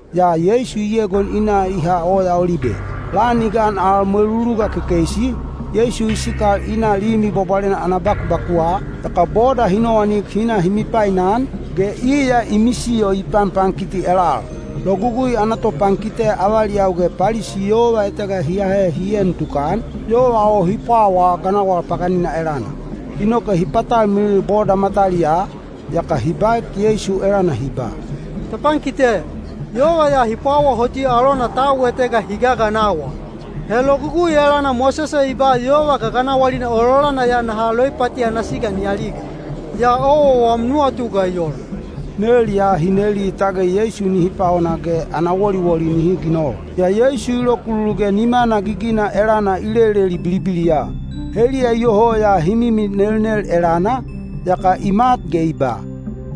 yaa Yeisu i egon i na i ha Oya Olibe. Lan i gan al mweluluga kekeisi, Yeisu i sikal i na Limi Bwabwalena ana bakubakuwa, yaka boda hi nowanik hi na hi mipainan, ge iya i misiyo i panpankiti elal. Logugui ana topankite avaliyau ge Palisi yova etega hi ahe hi en tukan, yova o hi pwawaa ganawal paganina elana. Inoke hi patalmilil boda mataliyaa, yaka hi baek Yeisu elana hi ba, “Topankite, yova ya hi pwawa hoti alona tau etega hi gaganawal. He Logugui elana Mosese i ba yova gaganawalina ololana ya naha loipati ana siga ni aliga. Yaa owa wam nuwatu ga i ola?” Nel ya hi neli tage Yeisu nihi paona ge ana woliwoli nihi ginol. Yaa Yeisu i lokululu ge nimana gigina elana i leleli bilibiliya. Heliya iyoho ya hi mimi nelnel elana, yaka i mat ge i ba,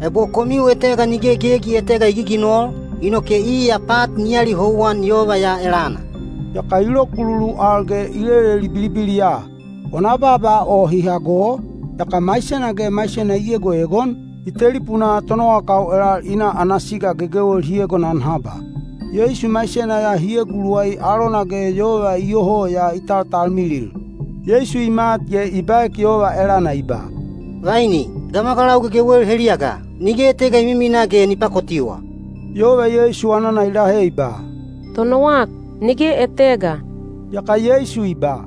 “Ebo komiu etega nige gegi etega i giginol, inoke iya pat ni alihouwan yova ya elana.” Yaka i lokululu al ge i leleli bilibiliya. Wana baaba o hi hago, yaka maisena ge maisena i egoegon, i telipunaa tonowakau elal i na ana siga gegewel hi egonan haba. Yeisu maisena ya hi eguluwai alona ge yova iyoho ya i taltalmilil. Yeisu i mat ge i baek yova elana i ba, “Vaini, gamagalau gegewel heliya ga? Nige etega i mimina ge ni pakotiwa?” Yova Yeisu anana i lahe i ba, “Tonowak, nige etega.” Yaka Yeisu i ba,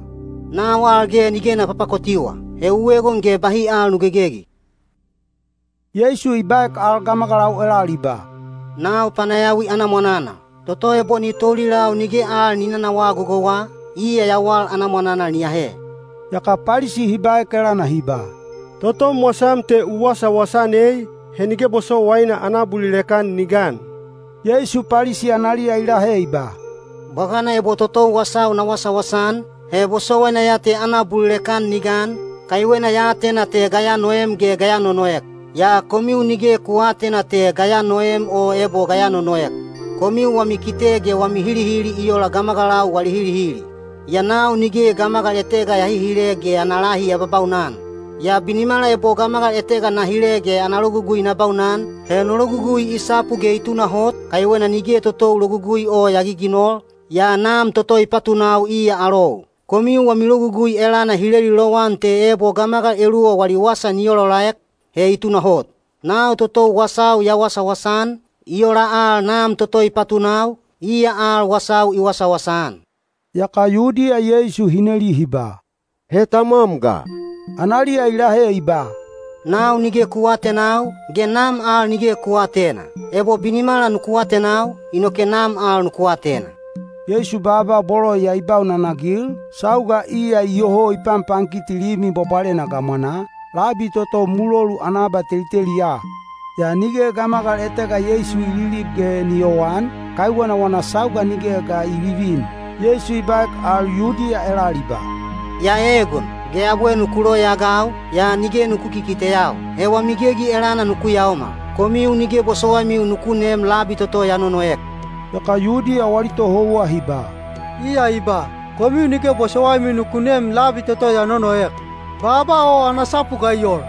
“Nau al ge nige na papakotiwa. He u egon ge bahi al nu gegegi.” Yeisu i baek al gamagalau elal i ba, “Nau panayawi ana mwananal. Toto ebo ni toulilau nige al ni nanawaa gogouwa, iya yawal ana mwananal ni ahe.” Yaka Palisi hi baek elana hi ba, “Totom wasam te u wasawasa-an ei, he nige bosowaina ana abulilek-an ni gan.” Yeisu Palisi analiya i lahe i ba, “Bwagana ebo totou wasau na wasawasa-an, he bosowaina ya te ana abulilek-an ni gan, kaiwena ya atena te ga ya noem ge ga ya nonoek. Yaa komiu nige ku aatena te ga ya noem o ebo ga ya nonoek. Komiu wami kite ge wami hilihili i ola gamagalau wali hilihili. Yaa nau nige gamagal etega ya hihile ge ana lahi ya babaunan. Yaa binimala ebo gamagal etega na hile ge ana logugui na baunan, he no logugui i sapu ge i tunahot, kaiwena nige totou logugui o ya giginol, yaa Nam toto i patunau iya alou. Komiu wami logugui elana hi leli lowan te ebo gamagalau eluwa wali wasa ni olaolaek, he i tunahot. Nau totou wasau ya wasawasa-an, i ola al Nam toto i patunau, iya al wasau i wasawasa-an.” Yaka Yudiya Yeisu hi neli hi ba, “He tamwam ga?” Analiya i lahe i ba, “Nau nige ku aatenau, ge Nam al nige ku aatena. Ebo binimala nuku atenau, inoke Nam al nuku atena.” Yeisu baaba bolo ya i baunanagil, sauga iya iyoho i panpankiti Limi Bwabwalena gamwanaa, labi toto mulolu ana abateliteliya. Yaa nige gamagal etega Yeisu i lilib ge ni yowan, kaiwena wana sauga nigeya ga i vivin. Yeisu i baek al Yudiya elal i ba, “Ya eegon, ge abwe nuku loyaagau, yaa nige nuku kikiteyau. He wami gegi elana nuku yaomal. Komiu nige bosowaimiu nuku nem labi toto ya nonoek.” Yaka Yudiya wali tohouwa hi ba, “Iya i ba, ‘Komiu nige bosowaimiu nuku nem labi toto ya nonoek.’ Baaba o ana sapu ga i ola?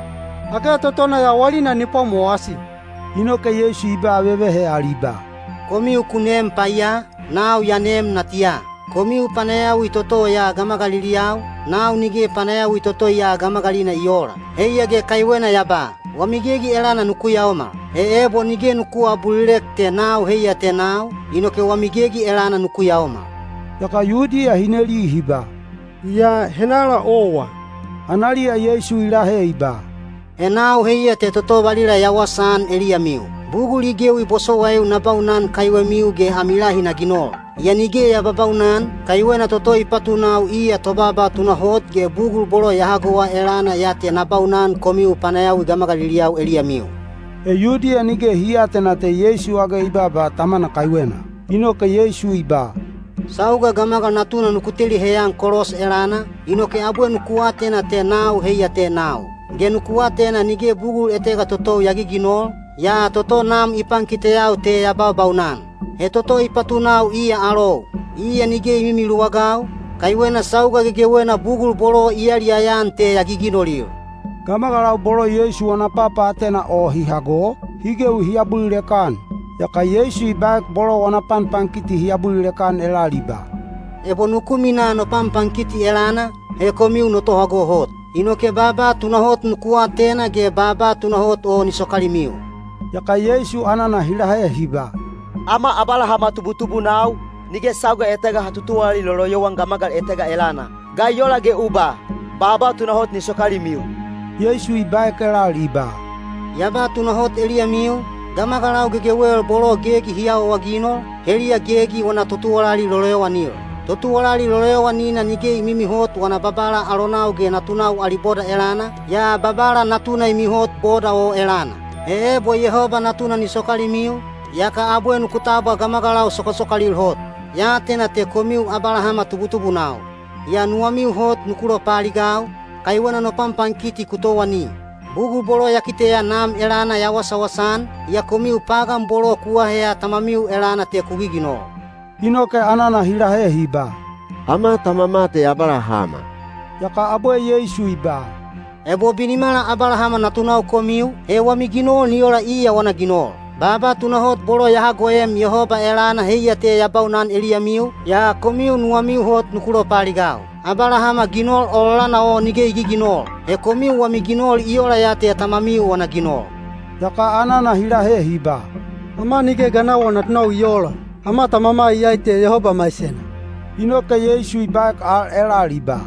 Age totona yawalina ni pwamowasi?” Inoke Yeisu i ba vevehe al i ba, “Komiu ku neem paiya, nau ya neem natiya. Komiu panayawi toto ya gamagaliliyau, nau nige panayawi toto ya gamagalina i oola. Heiya ge kaiwena ya ba, ‘Wami gegi elana nuku yaomal.’ He ebo nige nuku aabulilek te ‘Nau heiya te nau,’ inoke wami gegi elana nuku yaomal.” Yaka Yudiya hi neli hi ba, “Yaa henala owa?” Analiya Yeisu i lahe i ba, “He nau heiya te toto valila ya wasaan eliyamiu. Bugul i gewi bosowaiu na baunan kaiwemiu ge ami lahi na ginol. Yaa nige ya babaunan, kaiwena toto i patunau iya tobaaba tunahot ge bugul bolo ya hagowa elana ya te na baunan komiu panayawi gamagaliliyau eliyamiu.” He Yudiya nige hi aatena te Yeisu age i baaba Tamana kaiwena. Inoke Yeisu i ba, “Sauga Gamagal Natuna nuku teli heyan kolos elana, inoke abwe nuku atena te ‘Nau heiya te nau,’ ge nuku atena nige bugul etega totou ya giginol, yaa toto Nam i pankiteyau te ya baubaunan. He toto i patunau iya alou. Iya nige i mimiluwagau, kaiwena sauga gegewena bugul bolo i yaliyaya-an te ya giginolil.” Gamagalau bolo Yeisu wana papaatena o hi hago, hi gewi hi abulilek-an. Yaka Yeisu i baek bolo wana panpankiti hi abulilek-an elal i ba, “Ebo nuku minaa no panpankiti elana, he komiu no tohago hot. Inoke baaba tunahot nuku atena ge baaba tunahot o ni sokalimiu.” Yaka Yeisu anana hi lahe hi ba, “Ama Abalahama tubutubunau, nige sauga etega ha tutuwalali loloyowan gamagal etega elana. Ga i ola ge u ba, ‘Baaba tunahot ni sokalimiu’?” Yeisu i baek elal i ba, “Ya ba tunahot eliyamiu, gamagalau gegewel bolo gegi hi awaawaginol, heliya gegi wana totuwalali loloyowanil. Totuwalali loloyowanina nige i mimihot wana babala alonau ge natunau ali boda elana, yaa babala natuna i mihot boda o elana. He ebo Yehoba Natuna ni sokalimiu, yaka abwe nuku tabwa gamagalau sokasokalil hot. Ya atena te komiu Abalahama tubutubunau. Yaa nuwamiu hot nuku lopaaligau, kaiwena no panpankiti ku towani. Bugul bolo ya kiteya Nam elana ya wasawasa-an, yaa komiu pagan bolo ku aheya tamamiu elana te ku giginol.” Inoke anana hi lahe hi ba, “Ama tamama te Abalahama.” Yaka abwe Yeisu i ba, “Ebo binimala Abalahama natunau komiu, he wami ginol ni ola iya wana ginol. Baaba tunahot bolo ya hagoem Yehoba elana heiya te ya baunan eliyamiu, yaa komiu nuwamiu hot nuku lopaaligau. Abalahama ginol ololana o nige i giginol. He komiu wami ginol i ola ya te tamamiu wana ginol.” Yaka anana hi lahe hi ba, “Ama nige ganawal natunau i oola. Ama tamama iyai te Yehoba maisena.” Inoke Yeisu i baek al elal i ba,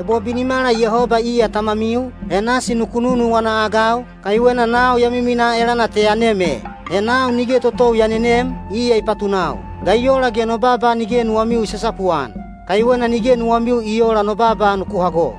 “Ebo binimala Yehoba iya tamamiu, he nasi nuku nunuwana-agau, kaiwena nau ya miminaa elana te ya nem e. He nau nige totou ya nenem, iya i patunau. Ga i ola ge no baaba nige nuwamiu i sasapuan? Kaiwena nige nuwamiu i oola no baaba nuku hago.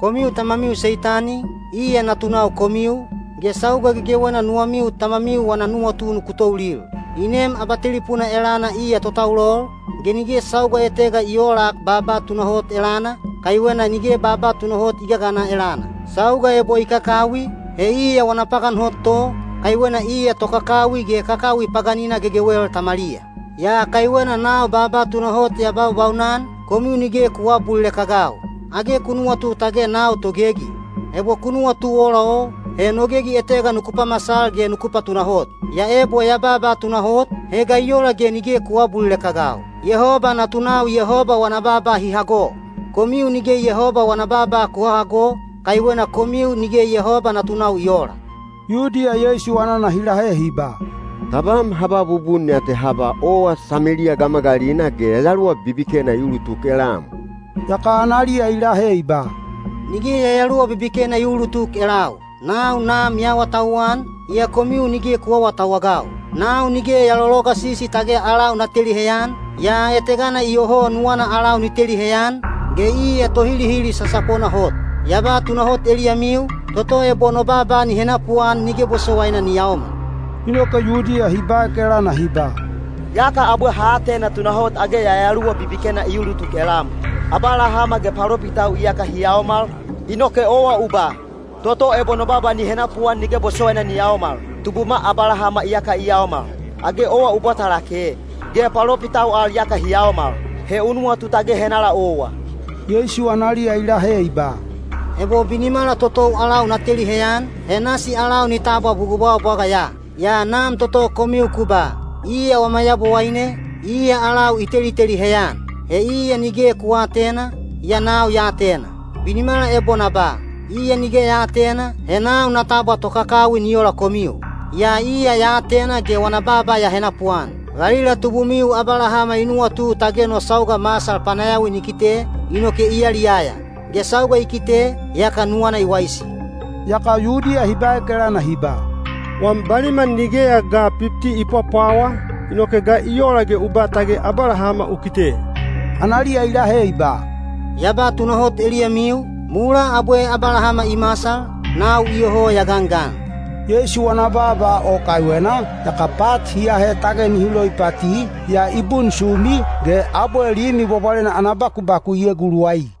Komiu tamamiu Seitani, iya natunau komiu, ge sauga gegewena nuwamiu tamamiu wana nuwatu nuku toulil. I neem abatelipuna elana iya totaulol, ge nige sauga etega i oolak baaba tunahot elana, kaiwena nige baaba tunahot i gagana elana. Sauga ebo i kakawi, he iya wana pagan hot to, kaiwena iya tokakawi ge kakawi paganina gegewel tamaliya. Yaa kaiwena nau baaba tunahot ya baubaunan, komiu nige ku aabulilek-agau. Age ku nuwatu tage nau togegi? Ebo ku nuwatu ola o, he no gegi etega nuku pamasal ge nuku patunahot. Yaa ebo ya baaba tunahot, he ga i ola ge nige ku aabulilek-agau? Yehoba natunau Yehoba wana baaba hi hago. Komiu nige Yehoba wana baaba ku hahago, kaiwena komiu nige Yehoba natunau i oola.” Yudiya Yeisu anana hi lahe hi ba, “Tabam ha ba bubun ya te ha ba owa Sameliya gamagalina ge yayaluwa bibikena i ulutuk elam!” Yaka analiya i lahe i ba, “Nige yayaluwa bibikena i uulutuk elau. Nau Nam ya awatauwan, yaa komiu nige ku aawatauwagau. Nau nige ya lologasisi tage alau na teli heyan, yaa etegana iyoho nuwana alau ni teli heyan, ge iya Tohilihili sasapona hot. Ya ba tunahot eliyamiu, toto ebo no baaba ni henapuan nige bosowaina ni yaomal.” Inoke Yudiya hi baek elana hi ba, “Yaka abwe ha atena tunahot age yayaluwa bibikena i ulutuk elam! Abalahama ge palopitau iyaka hi yaomal, inoke owa u ba, ‘Toto ebo no baaba ni henapuan nige bosowaina ni yaomal.’ Tubuma Abalahama iyaka i yaomal! Age owa u bwata lake? Ge palopitau al iyaka hi yaomal! He u nuwatu tage henala owa?” Yeisu analiya i lahe i ba, “Ebo binimala totou alau na teli heyan, he nasi alau ni tabwa bugul bwagabwaga ya. Yaa Nam toto komiu ku ba, ‘Iya wama Yabowaine,’ iya alau i teliteli heyan. He iya nige ku aatena, yaa nau ya atena. Binimala ebo na ba, ‘Iya nige ya aatena,’ he nau na tabwa tokakawi ni ola komiu. Yaa iya ya atena ge wana baaba ya henapuan. Valila tubumiu Abalahama i nuwatu tage no sauga masal panayawi ni kite, inoke i yaliyaya; ge sauga i kite, yaka nuwana i waisi.” Yaka Yudiya hi baek elana hi ba, “Wam baliman nigeya ga pipti i pwapwawa, inoke ga i ola ge u ba tage Abalahama u kite?” Analiya i lahe i ba, “Ya ba tunahot eliyamiu, mulaa abwe Abalahama i masal, nau iyoho ya gangan.” Yeisu wana baaba o kaiwena, yaka pat hi ahe tage nihi loipati, yaa i bunsumi, ge abwe Limi Bwabwalena ana bakubaku i eguluwai.